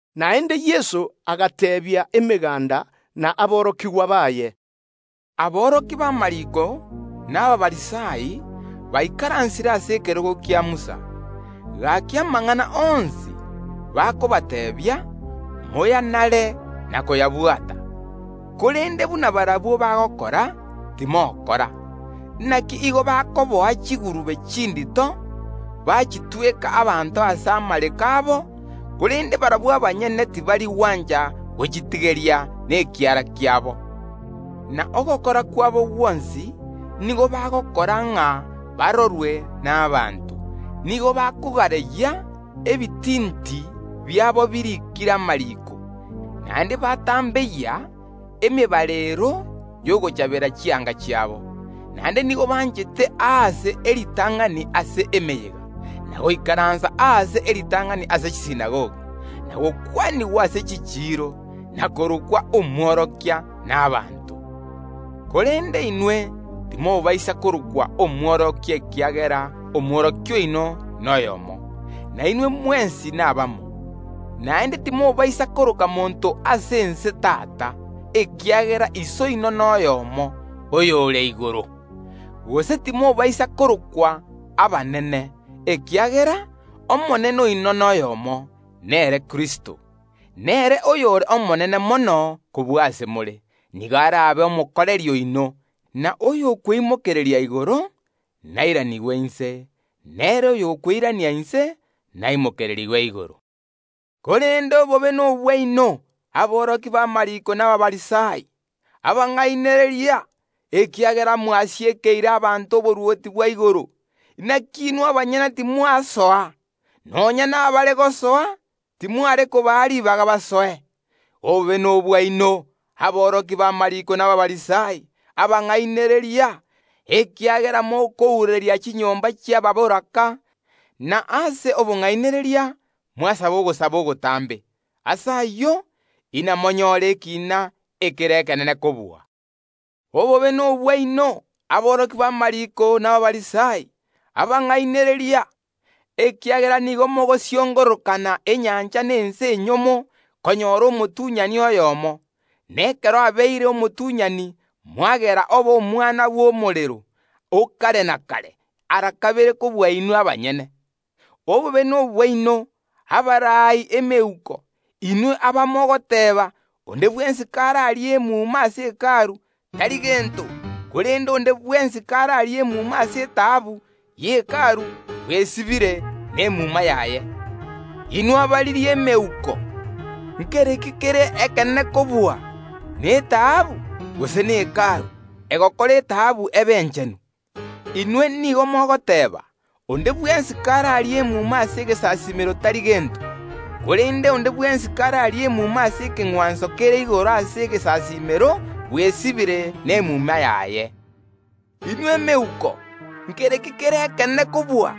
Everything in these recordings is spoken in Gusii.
Naende Yeso agateebia emeganda na aborokigwa baye, “Aborokia b’amariiko na Abafarisai baikaransire ase ekerogo kia Musa. Gaki, amang’ana onsi bakobateebia, moyanare na koyabwata; korende, timokora buna barabwo bagokora. Inaki nigo bakoboa chigurube chindito, bachitweka ase amareko y’abanto, korende barabwo abanyene tibari gwancha gochitigeria nekiara kiabo. Na ogokora kwabo gwonsi nigo bagokora ng’a barorwe nabaanto; nigo bakogareyia ebitinti biabo biriikire amariiko, naende batambeyia emebareero y’ogochabera chianga chiabo. Naende nigo banchete aase amasikani ase emeyega, na goikaransa aase ebirogo bi’amasikani ase chisinagogi, na gokwanigwa n’amasikani ase chichiiro, na korokwa Omwarimu n’abanto. Korende inwe timobaisa korokwa Omworokia, ekiagera Omwarimu oino noyomo, na inwe mwensi nabamo. Naende timobaisa koroka monto ase ense tata, ekiagera Iso oino noyomo, oyore igoro. Gose timobaisa korokwa abanene, ekiagera Omonene oino noyomo, nere Kristo. Nere oyore omonene mono kobua ase more, nigo arabe omokoreri oino, na oyo okweimokereria igoro nairanigwe inse, na ere oyokweirania inse naimokererigwe igoro. “Korende obobe nobwaino, aborokia b’amariiko na Abafarisai, abang’ainereria! Ekiagera mwasiekeire abanto oborwoti bwa igoro; naki inwe abanyene timori gosoa, na baria barigeti gosoa, timori kobaa ribaga basoe. [ Obobe nobwaino, aborokia b’amariiko na Abafarisai, abang’ainereria! Ekiagera mokounereria chinyomba chi’abatakaanwa, na ase obong’ainereria mwasaba ogosaba ogotambe. Ase ayio, inamonyore ekiina ekere ekenene kobua.] Obobe nobwaino, aborokia b’amariiko na Abafarisai, abang’ainereria! Ekiagera nigo mogosiongorokana enyancha na ense enyomo korigia omotunyani oyomo, na ekero abeire omotunyani, mwagera oba omwana bw’omorero o kare na kare ara kabere kobua inwe abanyene. “Obobe nobwaino, abaraai emeuko, inwe abamogoteeba: Onde bwensi kararie emuma ase Hekalu, tari gento, korende onde bwensi kararie emuma ase etaabu ye Hekalu, bwesibire n’emuma yaye. Inwe abariri emeuko! Nkereki kere ekenene kobua: netaabu, gose ne Hekalu egokora etaabu ebe enchenu? Inwe nigo mogoteeba: Onde bwensi kararie emuma ase egesasiimero tari gento; korende onde bwensi kararie emuma ase ekeng’wanso kere igoro ase egesasiimero bwesibire nemuma yaye. Inwe emeuko! Nkere ki kere ekenene kobua: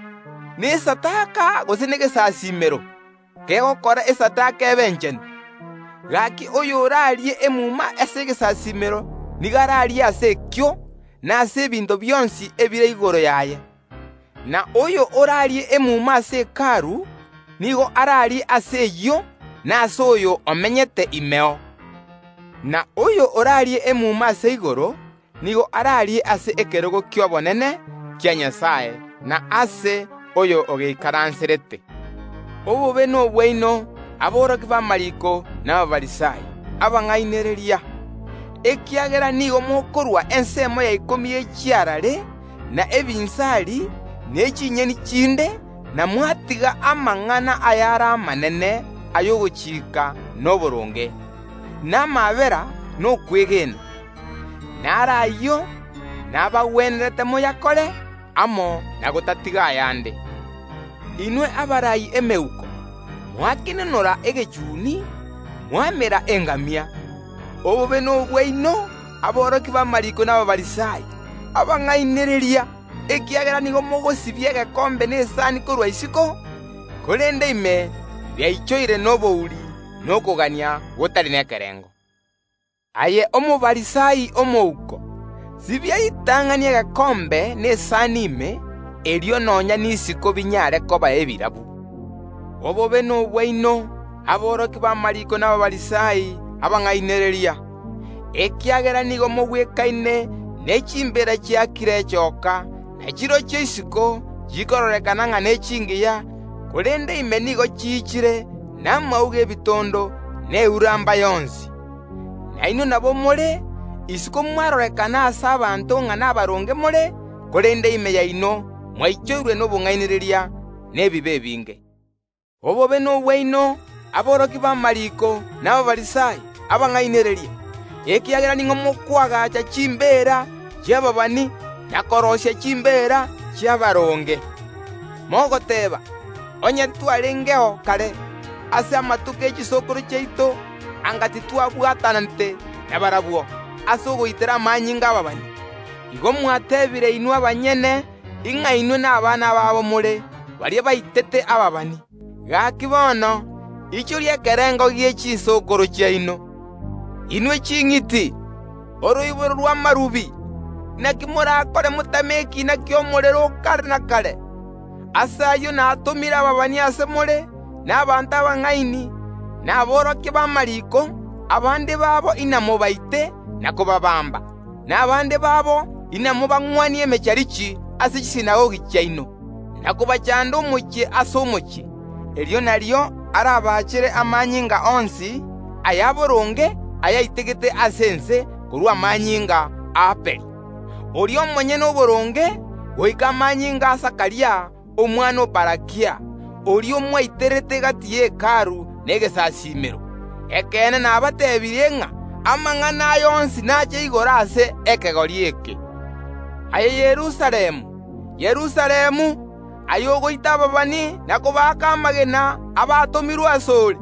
nesadaka, gose negesasiimero kegokora esadaka ebe enchenu? Gaki, oyorarie emuma ase egesasiimero nigo ararie ase ekio, na ase ebinto bionsi ebire igoro yaye. Na oyo orarie emuma ase Hekalu, nigo ararie ase eyio na ase oyo omenyete imeo. Na oyo orarie emuma ase igoro, nigo ararie ase ekerogo ki’obonene kia Nyasae na ase oria ogeikaranserete. “Obobe nobwaino, aborokia b’amariiko na Abafarisai, abang’ainereria ekiagera nigo mokorua ensemo ya ikomi ye chiarare, na ebinsari, ne chinyeni chinde, na mwatiga amang’ana ayare amanene y’ogochika na oboronge, na amaabera, na okwegena. Naro ayio nabagwenerete moyakore, amo na gotatiga ayande. Inwe abaraai emeuko, mwakenonora egechuni, mwamera engamia! “Obobe nobwaino, aborokia b’amariiko na Abafarisai, abang’ainereria! Ekiagera nigo mogosibia egekombe na esani korwa isiko, korende ime biaichoire nobouri na okogania gotari nekerengo. Aye Omofarisai omouko! Sibia ritang’ani egekombe na esani ime, erio nonya nisiko binyare koba ebirabu. “Obobe nobwaino, aborokia b’amariiko na Abafarisai, abang’ainereria! Ekiagera nigo mogwekaine nechimbeera chiakire echooka; na chirochio isiko chirorekana ng’a nechingiya, korende ime nigo chiichire namauga y’ebitondo, na euramba yonsi. Nainwe nabo more, isiko mwarorekana ase abanto ng’a nabaronge more, korende ime yaino mwaichoirwe nobong’ainereria na ebibe ebinge. “Obobe nobwaino, aborokia b’amariiko na Abafarisai, abang’ainereria! Ekiagera nigo mokoagaacha chimbeera chi’ababani, na kobaria chimbeera chi’abaronge, mogoteeba: Onye ntwarengeo kare ase amatuko ye chisokoro chiaito, anga titwabwatanete nabarabwo ase ogoitera amanyinga y’ababani. Igo mwetebire inwe abanyene, ng’a inwe nabana babo more, baria baitete ababani. Gaki bono, ichoria ekerengo gie chisokoro chiaino. Inwe ching’iti, oroiboro rw’echinchoka, naki morakore motame ekiina ki’omorero o kare na kare! Ase ayio natomire ababani ase more, na abanto abang’aini, na aborokia b’amariiko; abande babo inamobaite na kobaabamba, na abande babo inamobang’wanie emecharichi ase chisinagogi chiaino, na kobachanda omochie ase omochie. Erio nario arabachere amanyinga onsi ayaboronge ayaitegete ase ense, korwa amanyinga y’Abeli, oria omonyene oboronge, goika amanyinga a Zakaria, omwana o Barakia, oria mwaiterete gati ye Hekalu na egesasiimero. Ekeene nabateebirie ng’a amang’ana aya onsi naache igoro ase ekegori eke. “Aye Yerusalemu, Yerusalemu, omochie ogoita ababani na kobaaka amagena abatomirwe ase ore!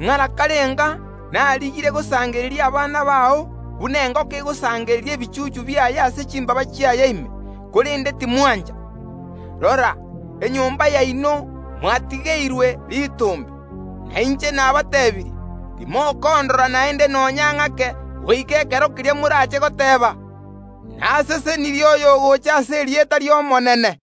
Ng’ara karenga narigirie gosangereria abana bao, buna engoko egosangereria ebichuchu biaye ase chimbaaba chiaye ime, korende timwancha! Rora, enyomba yaino mwatigeirwe ritombe. Na inche nabateebirie, timokondora naende nonya ng’ake goika ekero keria morache goteeba: Nasesenirie oyogocha ase erieta ri’Omonene.”